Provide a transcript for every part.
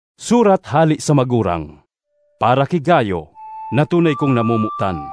Surat hale sa Magurang—Para ki Gayo na tunay kong namomotan.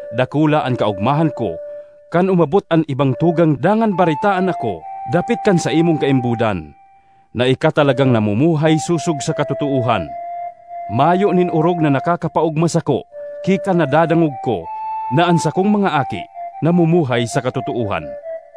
Dakula an kaogmahan ko kan umabot an ibang tugang dangan baretaan ako dapit kan saimong kaimbodan, na ika talagang namumuhay sosog sa katotoohan. Mayo nin orog na nakakapaogma sako ki kan nadadangog ko na an sakong mga aki namumuhay sa katotoohan.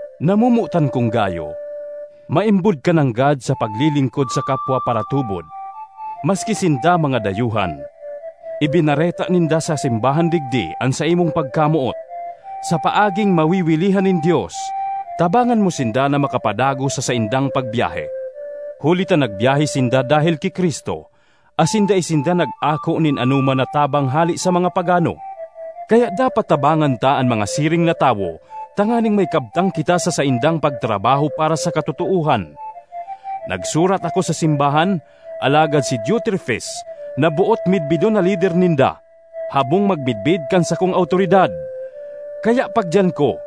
Namomotan kong Gayo, maimbod ka nanggad sa paglilingkod sa kapwa paratubod maski sinda mga dayuhan. Ibinareta ninda sa simbahan digdi an saimong pagkamoot. Sa paaging mawiwilihan nin Dios, tabangan mo sinda na makapadagos sa saindang pagbyahe. Huli ta nagbiyahe sinda dahel ki Cristo asin dai sinda nag-ako nin anoman na tabang hale sa mga pagano. Kaya dapat tabangan ta an mga siring na tawo tanganing may kabtang kita sa saindang pagtrabaho para sa katotoohan. Nagsurat ako sa simbahan, alagad si Diotrefes, na boot midbidon na lider ninda, habong magmidbid kan sakong awtoridad. Kaya pagdiyan ko,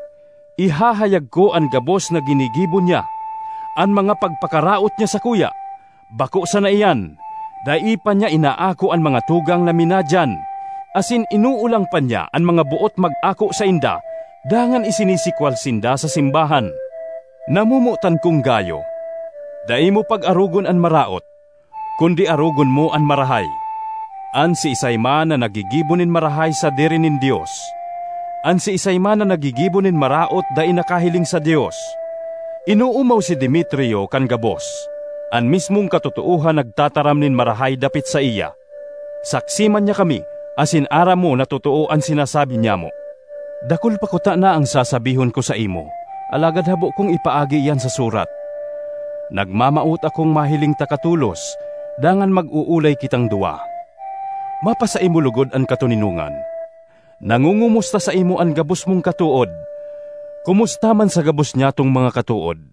ihahayag ko an gabos na ginigibo niya, an mga pagpakaraot niya sakuya. Bako sana iyan; dai pa niya inaako an mga tugang na minadiyan, asin inoolang pa niya an mga boot mag-ako sainda dangan isinisikwal sinda sa simbahan. Namomotan kong Gayo, dai mo pag-arogon an maraot, kundi arogon mo an marahay. An siisay man na naggigibo nin marahay sadiri nin Dios; an siisay man na naggigibo nin maraot dai nakahiling sa Dios. Inoomaw si Demetrio kan gabos; an mismong katotoohan nagtataram nin marahay dapit saiya. Saksi man niya kami, asin aram mo na totoo an sinasabi nyamo. Dakul pa kutana an sasabihon ko saimo, alagad habo kong ipaagi iyan sa surat. Nagmamawot akong mahiling taka tolos, dangan mag-oolay kitang duwa. Mapasaimo logod an katoninongan. Nangongomusta saimo an gabos mong katood. Komusta man sa gabos nyatong mga katood.